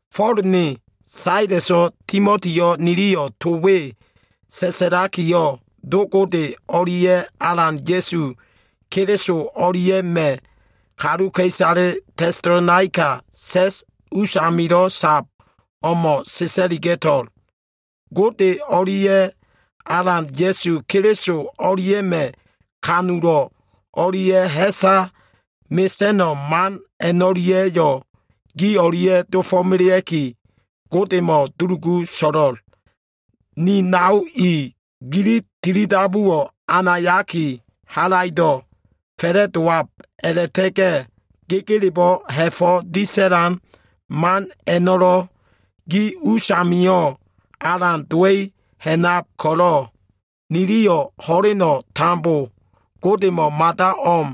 Fo꞉l ne, Saleso꞉, Timotiyo꞉ niliyo꞉ to we sa꞉sa꞉lakiyo꞉, Do Gode o꞉lia꞉ Alan Ya꞉su Keliso o꞉lia꞉ma꞉ kaluka꞉isale Tesalonaika sa꞉s usamilo꞉ sab o꞉mo꞉ sa꞉sa꞉liga꞉to꞉l. Gode o꞉lia꞉ Alan Ya꞉su Keliso o꞉lia꞉ma꞉ ha꞉fo꞉ disa꞉lan man o꞉lia꞉ ha꞉sa mesa꞉no꞉ man a꞉no꞉lia꞉yo꞉ gi o꞉lia꞉ dofo꞉melea꞉ki, Godemo꞉ dulugu so꞉lo꞉l. Ni nao i, gili tilidabuwo꞉ anayaki halaido꞉ fa꞉la꞉ndab a꞉la꞉ta꞉ga꞉ gegelebo꞉ ha꞉fo꞉ disa꞉lan man a꞉no꞉lo꞉ gi usamio꞉ alan dowa꞉i ha꞉nab ko꞉lo꞉ niliyo꞉ ho꞉leno꞉ tambo Godemo꞉ mada o꞉m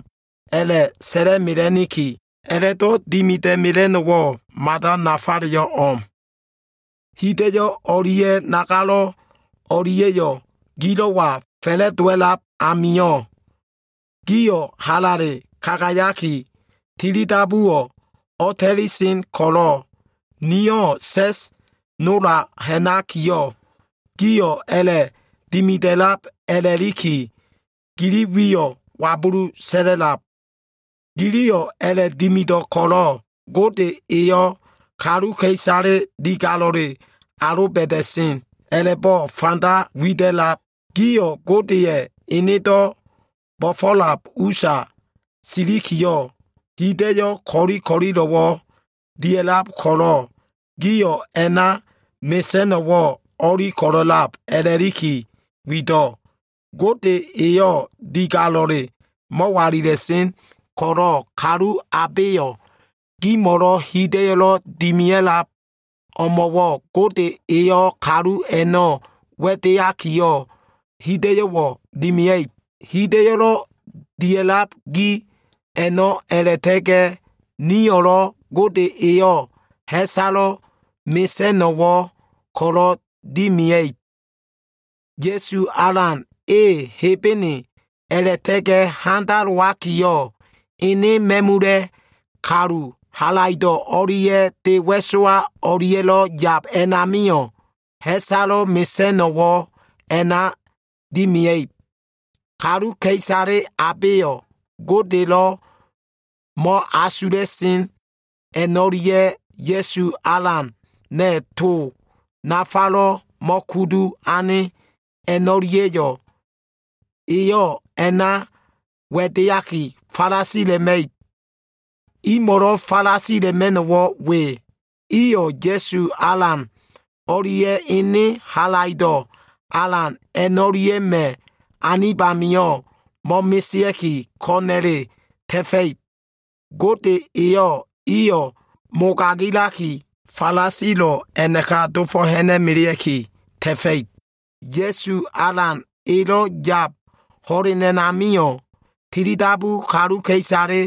a꞉la꞉sa꞉la꞉mela꞉niki. A꞉la꞉do꞉ dimida꞉mela꞉no꞉wo꞉ mada nafayo꞉ o꞉m. Hida꞉yo꞉ o꞉lia꞉ nagalo꞉ o꞉lia꞉yo꞉ gilo꞉wa fa꞉la꞉dowa꞉lab amio꞉, gio꞉ halale kagayaki, tilidabuwo꞉ o꞉ta꞉li sen ko꞉lo꞉ nio꞉ sa꞉s nola ha꞉nakiyo꞉, gio꞉ a꞉la꞉dimida꞉lab a꞉la꞉liki, gili wiyo꞉ wabulu sa꞉la꞉lab. Giliyo꞉ a꞉la꞉dimido꞉ ko꞉lo꞉ Gode eyo꞉ kaluka꞉isale digalo꞉le aloba꞉da꞉sen a꞉la꞉bo꞉ fanda wida꞉lab. Gio꞉ Godeya꞉ enedo꞉ bo꞉fo꞉lab usa silikiyo꞉, hida꞉yo꞉ ko꞉li ko꞉lilo꞉wo꞉ dia꞉lab ko꞉lo꞉, gio꞉ a꞉na mesa꞉no꞉wo꞉ o꞉li ko꞉lo꞉lab a꞉la꞉liki wido꞉. Gode eyo꞉ digalo꞉le mo꞉walila꞉sen ko꞉lo꞉, kalu abeyo꞉ gimo꞉lo꞉ hida꞉yo꞉lo꞉ dimia꞉lab o꞉mo꞉wo꞉ Gode eyo꞉ kalu a꞉no꞉ wa꞉deaki hida꞉yo꞉wo꞉ dimia꞉ib. Hida꞉yo꞉lo꞉ dia꞉lab gi a꞉no꞉ a꞉la꞉ta꞉ga꞉ nio꞉lo꞉ Gode eyo꞉ ha꞉salo꞉ mesa꞉no꞉wo꞉ ko꞉lo꞉ dimia꞉ib. Ya꞉su Alan e Hebene a꞉la꞉ta꞉ga꞉ handalowakiyo꞉, ene ma꞉mula꞉ kalu halaido꞉ o꞉lia꞉ de wa꞉sowa o꞉lia꞉lo꞉ yab a꞉namio꞉ ha꞉salo꞉ mesa꞉no꞉wo꞉ a꞉na dimia꞉ib. Kaluka꞉isale abeyo꞉ Godelo꞉ mo꞉asula꞉sen a꞉no꞉lia꞉ Ya꞉su Alana꞉ to nafalo꞉ mo꞉kudu ane a꞉no꞉lia꞉yo꞉, Eyo꞉ a꞉na wa꞉deaki falasila꞉ma꞉ib. Imo꞉lo꞉ falasila꞉ma꞉no꞉wo꞉ we. Iyo꞉ Ya꞉su Alan o꞉lia꞉ ene halaido꞉ alan a꞉no꞉lia꞉ma꞉ anib amio꞉ mo꞉mesea꞉ki, ko꞉na꞉le ta꞉fa꞉ib. Gode eyo꞉ iyo꞉ mogagilaki, falasilo꞉ a꞉naka dofo꞉ ha꞉na꞉melea꞉ki ta꞉fa꞉ib. Ya꞉su Alan elo꞉ yab ho꞉len a꞉namio꞉, tilidabu kaluka꞉isale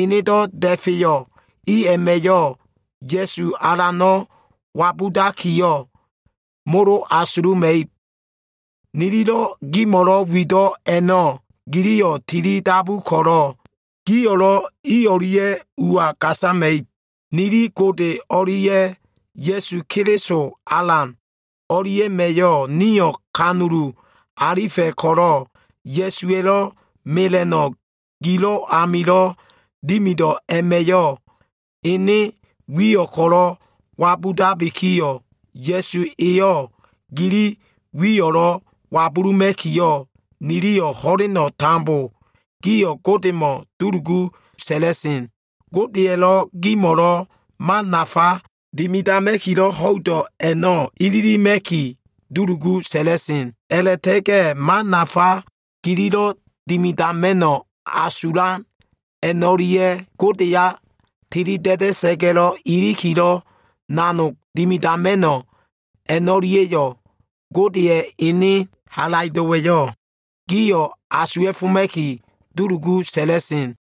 enedo꞉ da꞉feyo꞉ i a꞉ma꞉yo꞉ Ya꞉su Alano꞉ wabudakiyo꞉, molo asuluma꞉ib. Nililo꞉ gimo꞉lo꞉ wido꞉ a꞉no꞉ giliyo꞉ tilidabu ko꞉lo꞉ gio꞉lo꞉ i o꞉lia꞉ ua gasama꞉ib. Nili Gode o꞉lia꞉ Ya꞉su Keliso Alan o꞉lia꞉ma꞉yo꞉ nio꞉ kanulu alifa꞉ ko꞉lo꞉, Ya꞉suwa꞉lo꞉ mela꞉no꞉ gilo꞉ amilo꞉ dimido꞉ a꞉ma꞉yo꞉ ene wiyo꞉ ko꞉lo꞉ wabudabikiyo꞉, Ya꞉su eyo꞉ gili wiyo꞉lo꞉ wabuluma꞉kiyo꞉, niliyo꞉ ho꞉leno꞉ tambo gio꞉ Godemo꞉ dulugu sa꞉la꞉sen. Godeya꞉lo꞉ gimo꞉lo꞉ man nafa dimidama꞉kilo꞉ ho꞉ido꞉ a꞉no꞉ ililima꞉ki, dulugu sa꞉la꞉sen. A꞉la꞉ta꞉ga꞉ man nafa gililo꞉ dimidama꞉no꞉ asulan a꞉no꞉lia꞉, Godeya tilida꞉da꞉sa꞉ga꞉ ilikilo꞉ nanog dimidama꞉no꞉ a꞉no꞉lia꞉yo꞉, Godeya꞉ ene halaido꞉wa꞉yo꞉ gio꞉ asuwa꞉foma꞉ki, dulugu sa꞉la꞉sen.